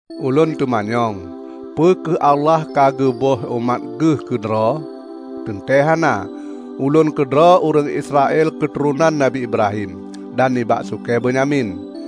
Ulôn teumanyong: Peu kheueh Allah ka geuböih umat geuh keudroe? Teuntée hana! Ulôn keudroe ureuëng Israel keuturonan nabi Ibrahim, dan nibak sukée Benyamin.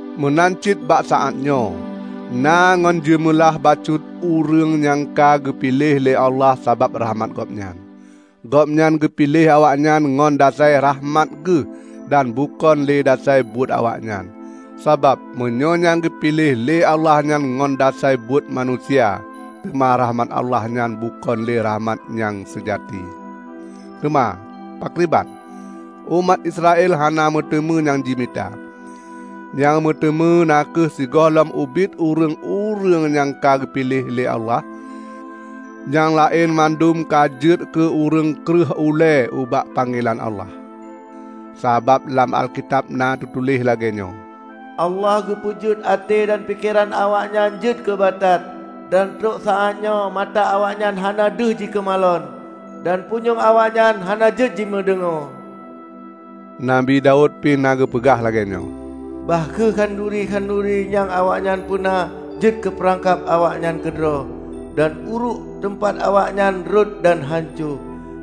Meunan cit bak saát nyoe: Na ngon jeumeulah bacut ureuëng nyang ka geupiléh lé Allah sabab rakhmat Gobnyan. Gobnyan geupiléh awaknyan ngon dasai rakhmat geuh dan bukon lé dasai buet awaknyan. Sabab meunyoe nyang geupiléh lé Allah nyan ngon dasai buet manusia, teuma rakhmat Allah nyan bukon le rakhmat nyang seujati. Teuma, pakriban? Umat Israel hana meuteumé nyang jimita. Nyang meuteumé na kheueh sigolongan ubit ureuëng-ureuëng nyang ka geupiléh lé Allah. Nyang laén mandum ka jeuet keu ureuëng kreueh ulée ubak panggelan Allah. Sabab lam Alkitab na teutuléh lagée nyoe, "Allah geupeujeuet até dan pikeran awaknyan jeuet keu batat; dan trok saátnyoe mata awaknyan hana deuh jikeumalon dan punyueng awaknyan hana jeuet jimeudeungoe." Nabi Daud pi na geupeugah lagée nyoe, "Bah kheueh khanuri-khanuri nyang awaknyan peuna jeuet keupeurangkab awaknyan keudroe, dan uruek, teumpat awaknyan rhot dan hanco!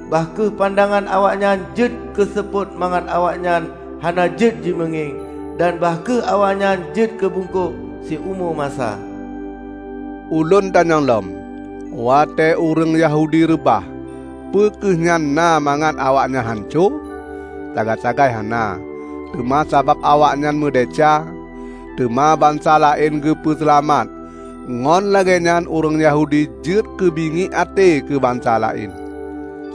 Bah kheueh pandangan awaknyan jeuet keuseupôt mangat awaknyan hana jeuet jimeungieng; dan bah kheueh awaknyan jeuet keu bungkôk siumu masa." Ulôn tanyong lom: Watée ureuëng Yahudi reubah, peu kheueh nyan na mangat awaknyan hanco? Sagai-sagai hana! Teuma sabab awaknyan meudesya, teuma bansa laén geupeu seulamat, ngon lagée nyan ureuëng Yahudi jeuet keu bingiek até keu bansa laén.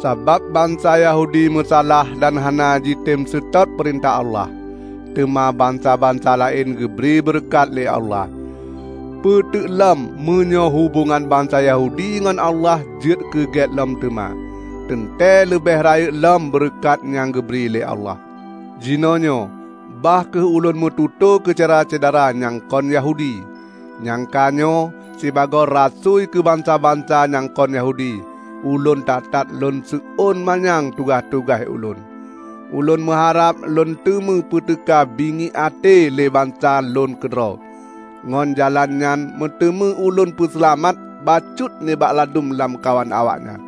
Sabab bansa Yahudi meusalah dan hana jitem seutôt peurintah Allah, teuma bansa-bansa laén geubri beureukat lé Allah. Peue teuklom meunyoe hubongan bansa Yahudi ngon Allah jeuet keu gét lom teuma; teuntée leubeh rayeuk lom beureukat nyang geubri lé Allah! Jinoenyoe bah kheueh ulôn meututoe keu Syedara-syedara nyang kon Yahudi! Nyang ka nyoe, sibagoe rasui keu bansa-bansa nyang kon Yahudi, ulôn that-that lôn seuôn manyang tugaih-tugaih ulôn. Ulôn meuharab lôn teumé peuteuka bingiek até lé bansa lôn keudroe, ngon jalan nyan meuteumé ulôn peuseulamat bacut nibak ladum lamkawan awaknyan.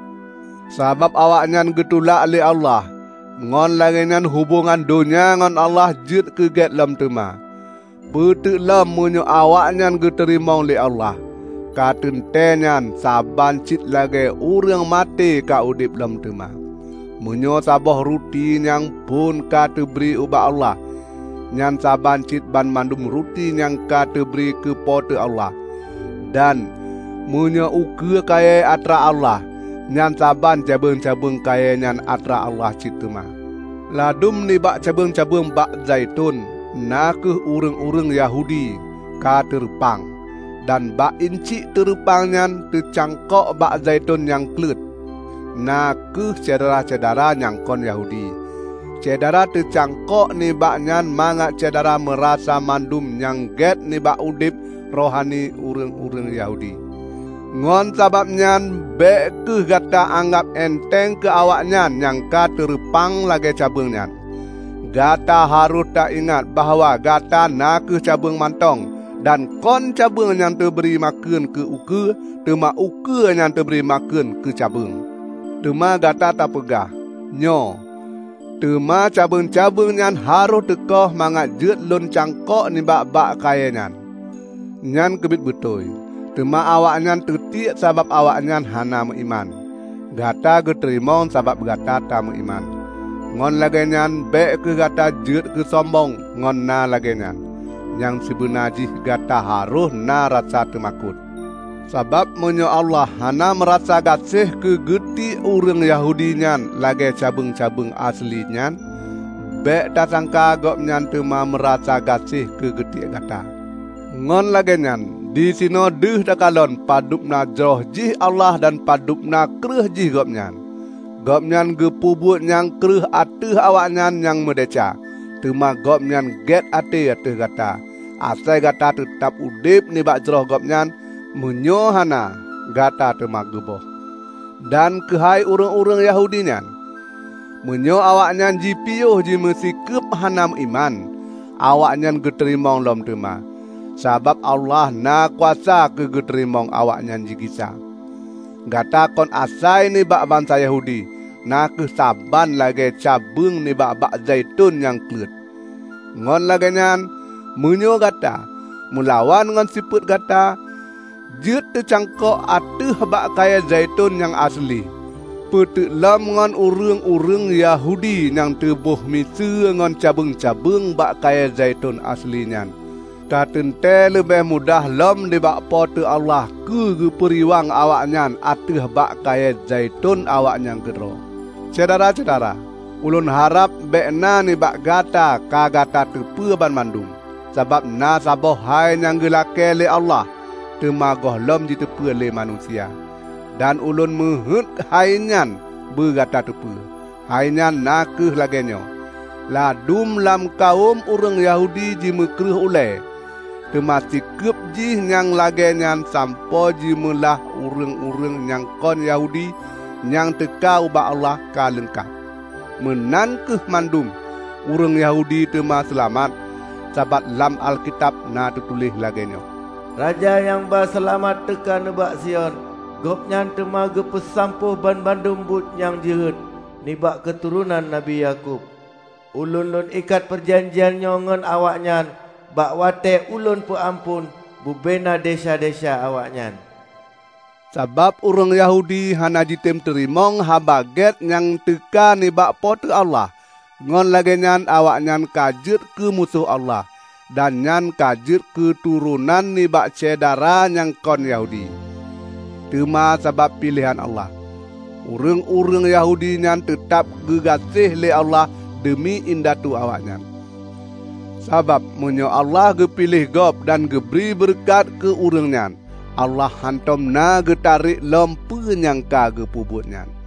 Sabab awaknyan geutulak lé Allah, ngon lagée nyan hubongan donya ngon Allah jeuet keu gét lom teuma; peuteuk lom meunyoe awaknyan geuteurimong lé Allah! Ka teuntée nyan saban cit lagée ureuëng maté ka udeb lom teuma! Meunyoe saboh ruti nyang phon ka teubri ubak Allah, nyan saban cit banmandum ruti nyan ka teubri keu Po teu Allah. Dan meunyoe ukeue kayée atra Allah, nyan saban cabeueng-cabeueng kayée nyan atra Allah cit teuma. Ladum nibak cabeueng-cabeueng bak zaiton -- na kheueh ureuëng-ureuëng Yahudi -- ka teureupang. Dan bak inciek teureupang nyan teucangkok bak zaiton nyang kleuet, na kheueh Syedara-syedara nyang kon Yahudi. Syedara teucangkok nibak nyan mangat Syedara neurasa mandum nyang gét nibak udeb rohani ureuëng-ureuëng Yahudi. Ngon sabab nyan bék kheueh gata anggab enteng keu awaknyan nyang ka teureupang lagée cabeueng nyan. Gata harôh taingat bahwa gata na kheueh cabeueng mantong. Dan kon cabeueng nyang teubri makheun keu ukeue, teuma ukeue nyang teubri makheun keu cabeueng. Teuma Gata tapeugah, "Nyoe, teuma cabeueng-cabeueng nyan harôh teukoh mangat jeuet lôn cangkok nibak bak kayée nyan!" Nyan keubiet beutôi. Teuma awaknyan teutiek sabab awaknyan hana meuiman, digata geuteurimong sabab Gata tameuiman. Ngon lagée nyan bék kheueh Gata jeuet keusombong ngon na lagée nyan; nyang sibeuna jih Gata harôh na rasa teumakot. Sabab meunyoe Allah hana meurasa gaséh keu geutiek ureuëng Yahudi nyang lagée cabeueng-cabeueng aseuli nyan, bék tasangka Gobnyan teuma meurasa gaséh keu geutiek Gata! Ngon lagée nyan disinoe deuh takalon padub na jroh jih Allah dan padub na kreueh jih Gobnyan. Gobnyan geupeubuet nyang kreueh ateueh awaknyan nyang meudesya, teuma Gobnyan gét até ateueh Gata -- asai Gata teutab udeb nibak jroh Gobnyan. Meunyoe hana, Gata teuma geuböih. Dan keuhai ureuëng-ureuëng Yahudi nyan, meunyoe awaknyan jipiôh jimeusikeub hana meuiman; awaknyan geuteurimong lom teuma; sabab Allah na kuasa keu geuteurimong awaknyan jigisa. Gata kon asai jih nibak bansa Yahudi na kheueh saban lagée cabeueng nibak bak zaiton nyang kleuet. Ngon lagée nyan, meunyoe Gata, meulawan ngon sifeuet Gata, jeuet teucangkok ateueh bak kayée zaiton nyang aseuli, peuteuk lom ngon ureuëng-ureuëng Yahudi nyang teubôh miseue ngon cabeueng-cabeueng bak kayée zaiton aseuli nyan. Ka teuntée leubeh mudah lom nibak Po teu Allah keu geupeuriwang awaknyan ateueh bak kayée zaiton awaknyan keudroe. Syedara-syedara! Ulôn harab bék na nibak gata ka gata teupeue banmandum. Sabab na saboh hai nyang geulakée lé Allah, teuma gohlom jiteupeu lé manusia. Dan ulôn meuheuét hainyoe beugata teupeue; hai nyan na kheueh lagée nyoe: Ladum lam kawöm ureuëng Yahudi jimeukreueh ulée, teuma sikeub jih nyang lagée nyan sampoe jeumeulah ureuëng-ureuëng nyang kon Yahudi nyang teuka ubak Allah ka leungkab. Meunan kheueh mandum ureuëng Yahudi teuma seulamat. Sabab lam Alkitab na teutuléh lagée nyoe, "Raja nyang ba seulamat teuka nibak Sion; Gobnyan teuma geusampôh banmandum buet nyang jeuhet nibak keuturonan Nabi Yakub. Ulôn Lôn ikat peujanjian nyoe ngon awaknyan bak watée Ulôn peuamphon bubena desya-desya awaknyan." Sabab ureuëng Yahudi hana jitem teurimong Haba Gét nyang teuka nibak Po teu Allah, ngon lagée nyan awaknyan ka jeuet keumusoh Allah; dan nyan ka jeuet keuturonan nibak Syedara nyang kon Yahudi. Teuma sabab piléhan Allah, ureuëng-ureuëng Yahudi nyan teutab geugaséh lé Allah deumi indatu awaknyan. Sabab meunyoe Allah geupiléh gob dan geubri beureukat keu ureuëng nyan, Allah hántom na geutarek lom peue nyang ka geupeubuet nyan.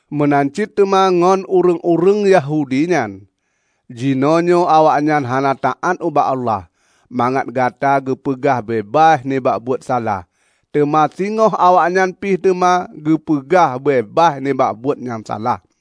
Meunan cit teuma ngon ureuëng-ureuëng Yahudi nyan. Jinoenyoe awaknyan hana taát ubak Allah, mangat gata geupeugah beubaih nibak buet salah. Teuma singoh awaknyan pih teuma geupeugah beubaih nibak buet nyang salah.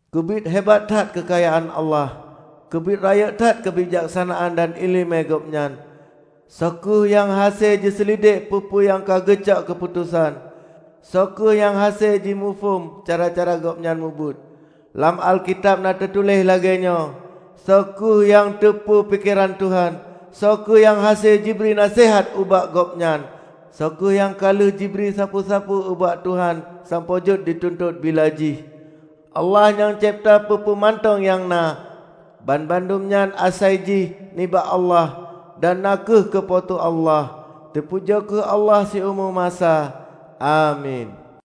Keubiet hebat that keukayaan Allah! Keubiet rayeuk that keubijaksanaan dan iéleumé Gobnyan! Soe kheueh nyang hase jiseulidek peue-peue nyang ka geucok keuputosan? Soe kheueh nyang hase jimuphom cara-cara Gobnyan mubuet? Lam Alkitab na teutuléh lagée nyoe, "Soe kheueh nyang teupeue pikeran Tuhan? Soe kheueh nyang hase jibri naseuhat ubak Gobnyan? Soe kheueh nyang ka lheueh jibri sapeue-sapeue ubak Tuhan sampoe jeuet jituntot bila jih?" Allah nyang cebta peue-peue mantong nyang na. Banmandum nyan asai jih nibak Allah dan na kheueh keu Po teu Allah. Teupujoe kheueh Allah siumu masa. Amin.